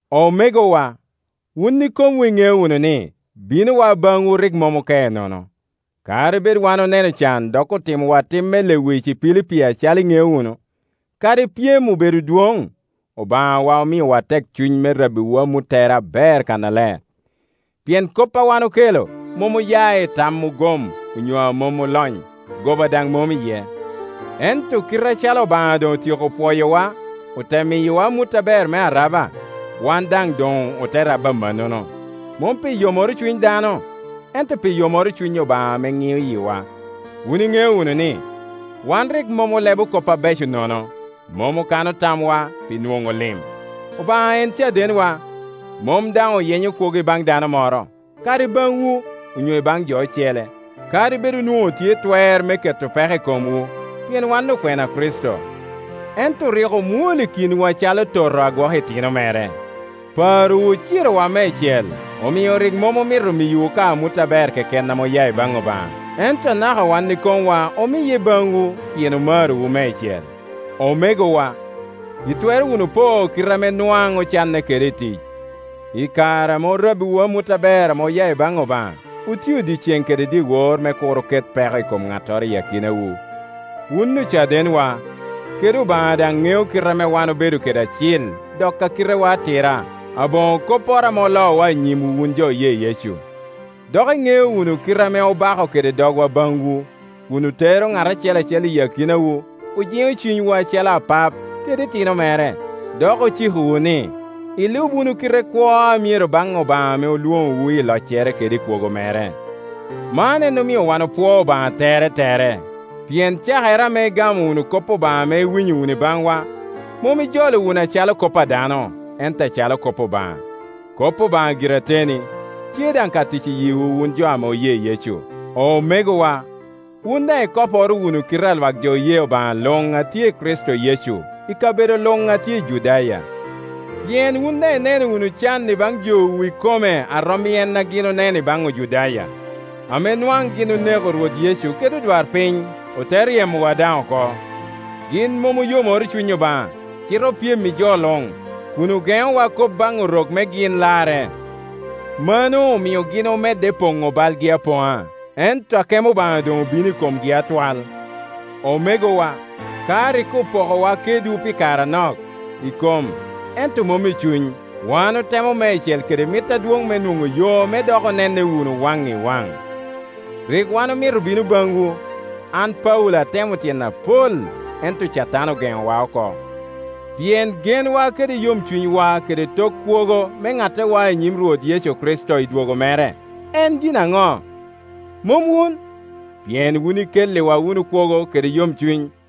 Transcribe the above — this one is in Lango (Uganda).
Omegowa, wun ikomwu iŋeo wunu ni, binowa baŋwu rik mom oke nono. Kadi bed wan oneno can dok otimowa tim me lewic i Pilipi acalo iŋeo wunu, kadi pyem obedo dwoŋ, Obaŋawa omiowa tekcuny me rabbiwu amuttere aber kannaler. Pien kop ame wan okelo mom oya i tam ogom onyo a mom olony, goba daŋ mom iye. Ento kite acalo Obaŋa doŋ otyeko pwoyowa, ote miyowa amut aber me araba, wan daŋ doŋ ote rabo amannono, mom pi yomoro cuny dano, ento pi yomoro cuny Obaŋa ame ŋio yiwa. Wun iŋeo wunu ni, wan rik mom olebo kop abeco nono, mom okano tamwa pi nwoŋo lim, Obaŋa en cadenwa. Mom daŋ oyenyo kwogo i baŋ dano moro, kadi i baŋwu onyo i baŋ jo ocele; kadi bed onwoŋo otye i twer me keto peko i komwu, pien wan okwena a Kricito. Ento rik omwol i kinwu acalo toto a gwoko itino mere. Parowu ocirowa meicel, omio rik mom omito miyowu ka amut aber keken ame oya i baŋ Obaŋa, ento anaka wan i komwa omiye baŋwu, pien omarowu meicel. Omegowa, itwero wunu po kite ame nwaŋ ocanne kede i tic, i kare ame orabbiwu amut aber ame oya i baŋ Obaŋa, otio dyeceŋ kede dyewor me kur oket peko i kom ŋattoro i akinawu. Wun ocadenwa, kede Obaŋa daŋ ŋeo kite ame wan obedo kede acil dok a kitewa atira, aboŋo kopporo ame oloowa i nyimwu wun jo oye Yecu. Dok iŋeo wunu kite ame obako kede dogwa baŋwu, kun otero ŋat acel acel i akinawu, ojiŋo cunywu acalo apap kede itino mere. Dok ocikowu ni, ilub wunu kite kwo a myero baŋ Obaŋa ame olwoŋowu i loccere kede i kwogo mere. Man en omio wan opwoo Obaŋa teretere, pien cakere ame igamo wunu kop Obaŋa ame iwinyo wunu i baŋwa, mom ijolo wunu acalo kop a dano, ento acalo kop Obaŋa. Kop Obaŋa gire ateni, tye daŋ ka tic i yiwu wun jo ame oye Yecu. Omegowa, wun daŋ ikoporo wunu kite a Iwak jo oye Obaŋa luŋ a tye i Kricito Yecu, i kabedo luŋ ame tye i Judaya, pien wun daŋ ineno wunu can i baŋ jowu ikome a rom i en a gin oneno i baŋ Ojudaya, ame nwaŋ gin oneko Rwot Yecu kede odwarpiny, ote ryemowa daŋ oko. Gin mom oyomoro cuny Obaŋa, cite opyem i jo luŋ, kun ogeŋowa kop baŋ Orok me gin larre. Mano omio gin omedo poŋo balgi apoŋa. Ento akemo Obaŋa doŋ obino i komgi atwal. Omegowa, ka rik opokowa kedwu pi kare anok, i kom ento mom i cuny, wan otemo meicel kede mit adwoŋ me nwoŋo yo me dok onenne wunu waŋ i waŋ. Rik wan omito bino baŋwu. An Paulo atemo tyen apol, ento Catan ogeŋowa oko. Pien genwa kede yomcunywa kede tok kwogo me nattewa i nyim Rwot Yecu Kricito i dwogo mere, en gin aŋo? Mom wun? Pien wun ikelliwa wunu kwogo kede yomcuny.